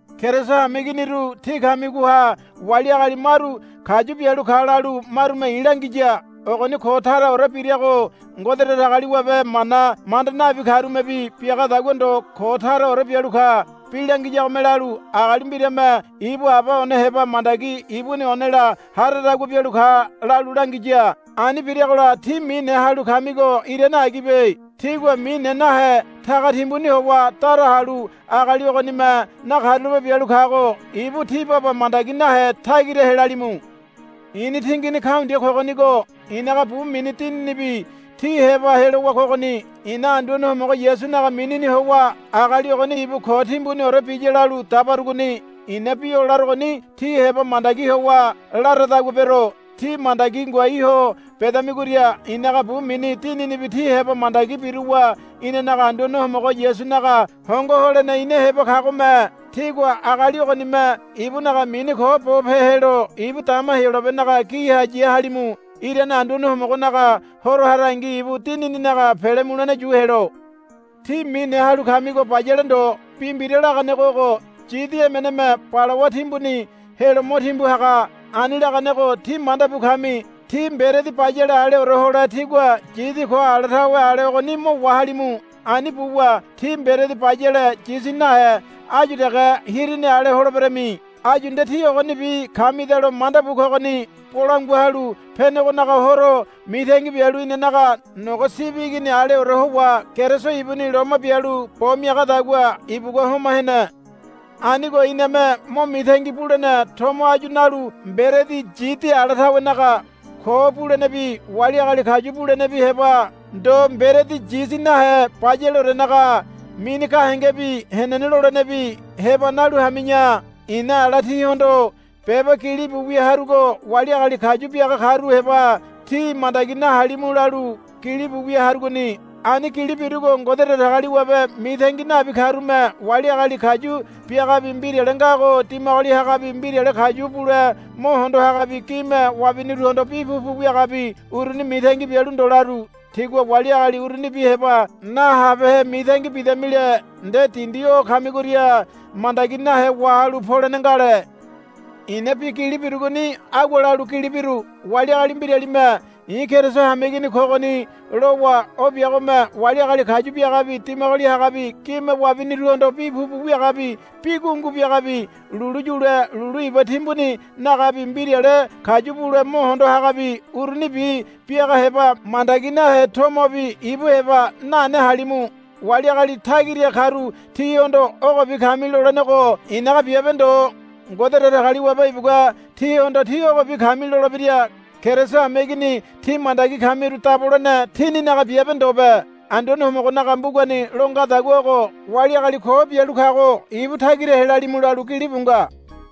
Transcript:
Keriso hameiginiru tí kamigoha wali agali maru kayu bialu ka lalu marume i̱ langiya. Ogoni ko taraore birago Ngode Datagaliwabe mana manda nabi karumebi biagadagua ndo ko taraore bialu ka. Bi langiyagome lalu, Agali mbirame ibu aba one heba mandagi ibuni onela haradagua bialu ka, lalu langiya. Ani biragola tí mine halu kamigo irane agibe. Tígua mine nahe taga timbuni howa dara halu agali ogonime nakarulape bialu kago ibu tí baba mandagi nahe tagira helalimu. I̱ni tingini kaundia kogonigo i̱naga bu mini dininibi tí heba helowa kogoni. I̱na Anduane Homogo Yasunaga minini howa agali ogoni ibu ko timbuniore biya lalu dabarugoni. I̱na bi o larogoni tí heba mandagi howa laradagua bero. Tí mandagi ngoai ho bedamigoria i̱naga bu mini dininibi tí heba mandagi biruwa inanaga Anduane Homogo Yasunaga hongo holene ina heba kagome tígua agali ogonime ibunaga mini ko bo pelo ibu dama Heyolabenaga giha ya halimu. Irane Anduane Homogonaga Horo harangi ibu dinininaga pele mulene yu helo. Tí mine halu kamigo bayale ndo. Bi mbira laganego ogo, Yidi emeneme balawa timbuni helo mo timbu haga, ani laganego tí manda bu kami. Tí mberedi bayale aleore hole tígua yidi ko ala tawe ale ogoni mo wahalimu. Ani buwa tí mberedi bayale yidi nahe áyu dege hirini ale holeberami. Áyu nde tí ogonibi kamidalo manda bu kogoni. Bolangua Halu Penegonaga Horo mitangi bialu inanaga nogo sibi igini aleore howa Keriso ibuni loma bialu bo miagadagua ibugua homa hene. Anigo iname mo mitangi bulene tomo áyu nalu mberedi yidi ala tawenaga ko bulenebi wali agali kayu bulenebi heba ndo mberedi yidi nahe bayaleorenaga mini gahengebi henene lolenebi heba nalu hami̱ya. I̱na ala tíhondo beba gilibu wia harugo wali agali kayu biaga karu heba tí mandagi nahalimu lalu gilibu wia harugoni. Ani gili birugo Ngode Datagaliwabe mitangi nabi karume wali agali kayu biagabi mbirale ngago dimagoli hagabi mbirale kayu bule mo hondo hagabi gime wabiniruhondo bi pupu wiagabi uruni mitangi bialu ndo laru. Tígua wali agali urunibi heba nahabehe mitangi bidamile nde dindi o kamigoria mandagi nahe wahalu polene ngale. I̱na bi gili birugoni agua lalu gili biru. Wali agali mbiralime, I̱ Keriso hameigini kogoni, lowa o biagome wali agali kayu biagabi dimagoli hagabi gime wabiniruhondo bi pupu wiagabi bi gungu biagabi lulu yule lulu iba timbuni nagabi mbirale kayu bule mo hondo hagabi urunibi biaga heba mandagi nahe tomobi ibu heba nane halimu. Wali agali tagira karu tihondo ogobi kami lolenego i̱naga biabe ndo. Ngode Datagaliwabe ibugua tihondo tí ogobi kami lolebira. Keriso hameigini tí mandagi kamiru dabolene tíninaga biabe ndobe. Anduane Homogonaga mbugani lo ngadagua ogo, Wali agali ko bialu kago ibu tagira helalimu, lalu gilibu nga.